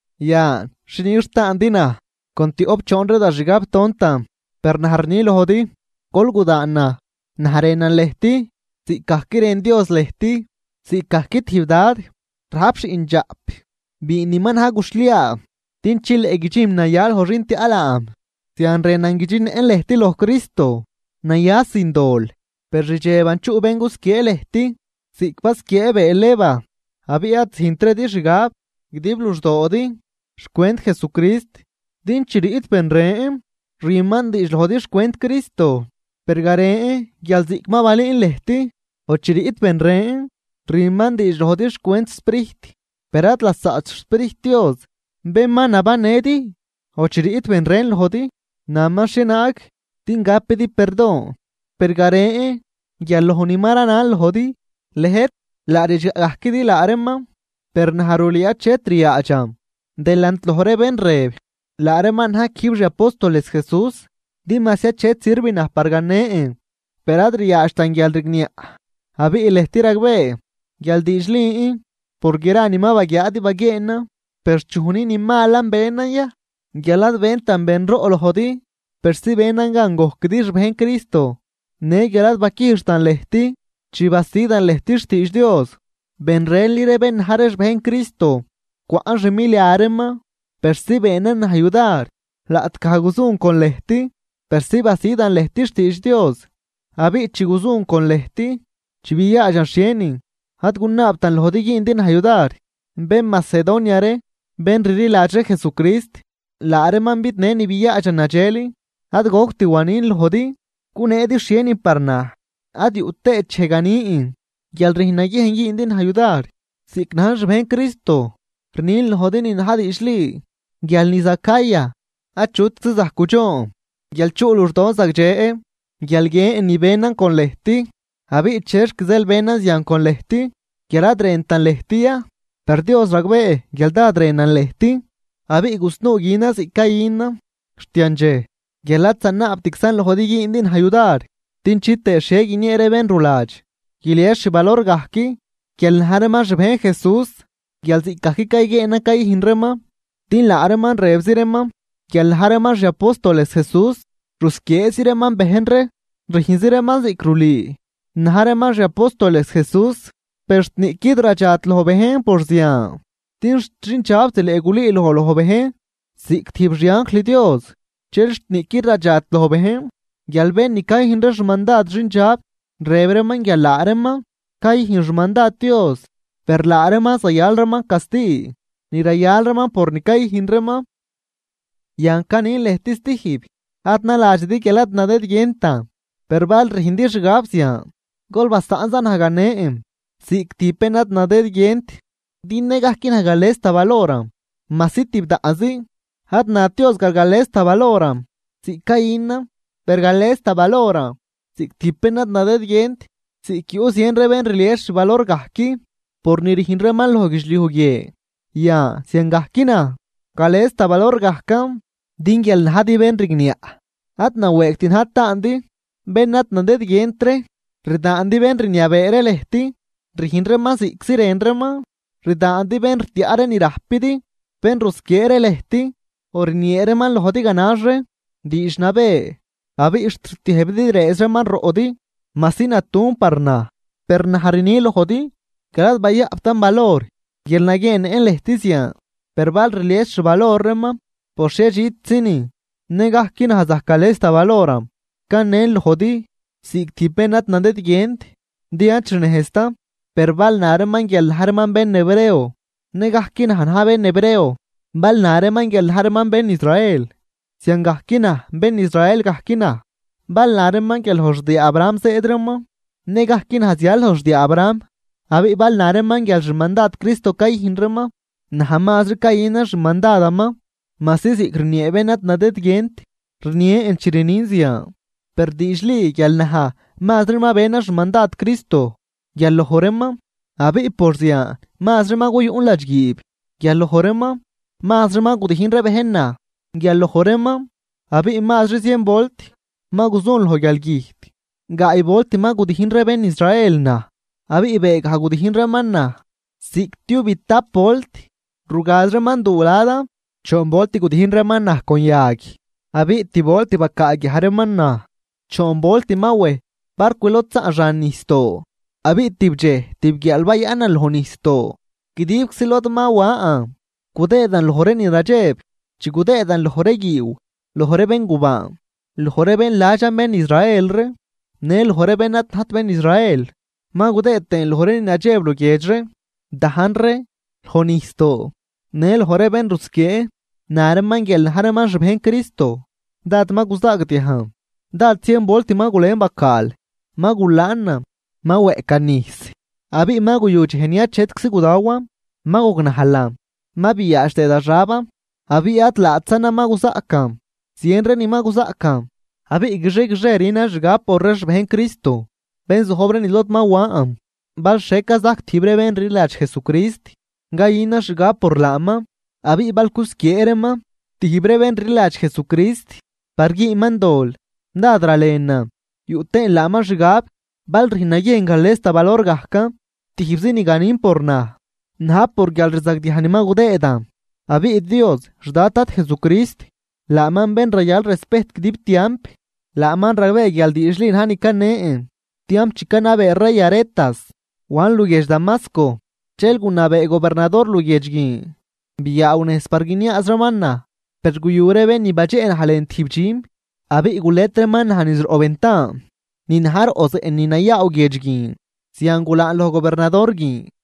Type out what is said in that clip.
Yan, ¡Xi nix taandi naj con tioꞌp choon ree da xgab tontan! Per naj rni lojdi gol gudaan naj. Naj rënan lëjt ziꞌcgajc rën Dios lëjt. Ziꞌcgajc tijb dad rajp xiꞌndxaꞌp biin ni ma na̱j guxhliaa din chileꞌ guidxinm naya loj xin tiaꞌ laam, zian rënan guidxinëꞌn lëjt loj Cristo naya sin dol. Per rdxeban chuꞌ bén gusquiee lëjt ziꞌc basquiee bëël Eva, abiꞌ ad züjntridi xgab guidib luxdoodi xcwent Jesucrist. Din chi riꞌt ben ren rüman diidx lojdi xcwent Cristo, per garen guial ziꞌc ma balüün lëjt, o chi riꞌt bén ren rüman diidx lojdi xcwent Sprijt, per ad lasaꞌt xSprijt Dios bén ma nabannëdi, o chi riꞌt ben ren lojdi naman xhienaag din gapidi perdon, per garen guial loj ni ma ranan lojdi, lëjt laa ridxgaꞌ gajquidi laa reeman. Per naj rulüü achet ryaadxan delant loj ree bén rëb laa reeman na̱j quijb xi apóstoles Jesús. Din majsi achet sirv naj par ganen, per ad ryaadxtan guialrigniaꞌ abiꞌ lëjt ragbee guial diidxlin por gra ni ma baguiaadi baguieenan. Per, ¿chuj ni ni malan benan ya guial ad bentan benroꞌ lojdi persi benan gan gojquidi xbejn Cristo, në guial ad baquijxtan lëjt chi basidan lëjt xtiidx Dios? Ben renli ree bén na̱j ree xbejn Cristo cwaꞌn xmilia reeman persi beenan naj yudar laꞌtgaj guzun con lëjt persi basidan lëjt xtiidx Dios. Abiꞌ chi guzun con lëjt, chi biaadxan xhienin ad gunaabtan lojdi güündi naj yudar, bén Macedonia ree bén rliladx ree Jesucrist laa reeman bidnë ni biaadxan nadxel. Ad goct wanin lojdi guneedi xhienin par naj, ad yuꞌ tëët dxej ganin guial rüjn naguiejn güündi naj yudar. Ziꞌc najn xbejn Cristo rnin lojdi ni na̱j diidxli, guial niz Acaya Achutczi zajc gudxoon guial chuꞌ luxdon zagdxe guial guiën ni benan con lëjt. Abiꞌ ¿chexc zeel benan zian con lëjt? ¿Guial ad rëntan lëjt ya? Per Dios ragbee guial dád rënan lëjt. Abiꞌ gusnuu günan ziꞌc cayünan xt yandxej guial ad zanaabtczan lojdi güündi naj yudar, din chitëë xhie guiniee ree bén ruladx guilies xvalor gajc guial na̱j reeman xbejn Jesús guial ziꞌcgajc cayguieenan cayüjn reeman. Din laa reeman rëbzi reeman guial na̱j reeman xi apóstoles Jesús, rusquieezi reeman bejn ree rüjnzi reeman ziꞌc rulüü na̱j reeman xi apóstoles Jesús. Per xt niꞌquid radxat loj bejn por zian, din xt xindxab zileꞌ gulüüloj loj bejn ziꞌc tijb xianjl Dios. Dxel xt niꞌquid radxat loj bejn guial bén ni cayüjn ree xmandad xindxab rëb reeman guial laa reeman cayüjn xmandad Dios. Per laa reeman zayal reeman casti ni rayal reeman por ni cayüjn reeman. Yan canin lëjt stijb: Ad naladxidi guial ad nadëdguientan, per bal rüjndi xgab zian gol basaꞌn za naj ganen ziꞌc tijb bén ad nadëdguient din nëgajc naj gales da valoran majsi tibdaꞌnzi. Ad nat Dios guial gales da valoran ziꞌc cayünan, per gales da valoran ziꞌc tijb bén ad nadëdguient. Ziꞌc yuꞌ zien ree bén rlies xvalor gajc por ni rüjn reeman loj guidxliuj guie, yan ziangajc naj gales da valor gajcan. Din guial najdi bén rigniaꞌ ad nawëëgt na̱j taandi bén ad nadëdguient ree. Rdaandi bén rniabee ree lëjt rüjn reeman ziꞌctzi rën reeman, rdaandi bén rtiaꞌ ree ni rajpidi, bén rusquiee ree lëjt, o rniee reeman lojdi ganax ree diidx nabë abiꞌ xt rtiëjbidi rëëz reeman roꞌdi. Majsi natuꞌn par naj, per naj rni lojdi guial ad bayaꞌptan valor guial naguieennëꞌn lëjt zian. Per bal rlies xvalor reeman por xhiedxitzinin, nëgajc naj zajc gales da valoran. Canen lojdi ziꞌc tijb bén ad nadëdguient, din ad xnejztan. Per bal na reeman guial na̱j reeman bén Hebreo, nëgajc naj na̱j bén Hebreo. Bal na reeman guial na̱j reeman bén Israel, ziangajc naj bén Israel gajc naj. Bal na reeman guial loj xdiaa Abraham zëëd reeman, nëgajc naj zial loj xdiaa Abraham. Abiꞌ bal na reeman guial xmandad Cristo cayüjn reeman, naj mazri cayünan xmandadaman. Majsi ziꞌc rniee bén ad nadëdguient rnien chi rnin zian, per diidxli guial naj mazri ma benan xmandad Cristo guial loj reeman. Abiꞌ por zian mazri ma guyun ladxguiib guial loj reeman, mazri ma gudijn ree bejn naj guial loj reeman abiꞌ mazri zien volt ma guzun loj guialgüjt. Gaay volt ma gudijn ree bén Israel naj, abiꞌ beegaj gudijn reeman naj ziꞌctiubitap volt rugaz reeman duu ladan. Choon volt gudijn reeman naj con yag, abiꞌ tib volt bacaaguiaj reeman naj. Choon volt ma wej barcw lod zaꞌn xan nijsdoo, abiꞌ tibdxej tibguiaal bayaꞌnan loj nijsdoo. Guidibczi lod ma wan, gudëëdan loj ree ni nadxeb chi gudëëdan loj ree guiiw, loj ree béngubaan, loj ree bén ladxan bén Israel ree në loj ree bén ad najt bén Israel. Ma gudëëd tëën loj ree ni nadxeb luguiedx ree, dajn ree, loj nijsdoo, në loj ree bén rusquiee na reeman guial na̱j reeman xbejn Cristo. Dád ma guzaagdiajn. Dád zien volt ma gulën bacaal, ma gulaanan, ma weꞌcan nijs, abiꞌ ma guyu dxej ni achetczi gudawan. Ma gognajlan, ma biaadx tëë da xaban. Abiꞌ ad laatzanan ma guzaꞌcan, zien ree ni ma guzaꞌcan. Abiꞌ guixie guixie rünan xgab por ree xbejn Cristo bén zojb ree niz lod ma wan. Bal xhie cazajc tijb ree bén rliladx Jesucrist, cayünan xgab por laaman. Abiꞌ bal cusquiee reeman tijb ree bén rliladx Jesucrist par güünman dol, dád ralenan yuꞌ tëën laaman xgab. Bal rüjn naguiejn gales da valor gajcan, tijbzi ni ganin por naj, na̱j por guialrzagdiaj ni ma gudëëdan. Abiꞌ Dios xDad Dad Jesucrist, laaman bén rayal respejt guidib tiamp, laaman ragbee guial diidxli na̱j ni canen. Tiamp chi canabee rey Aretas, wan luguiedx Damasco dxel gunabee gobernador luguiedx guin biaaw nejz par guiniaaz reeman naj. Per guyu ree bén ni badxeꞌ naj lën tijb dxüm abiꞌ gulet reeman naj niz roꞌ ventan ni na̱j roꞌ zeꞌ ni nayaw guiedx guin, zian gulaan loj gobernador guin.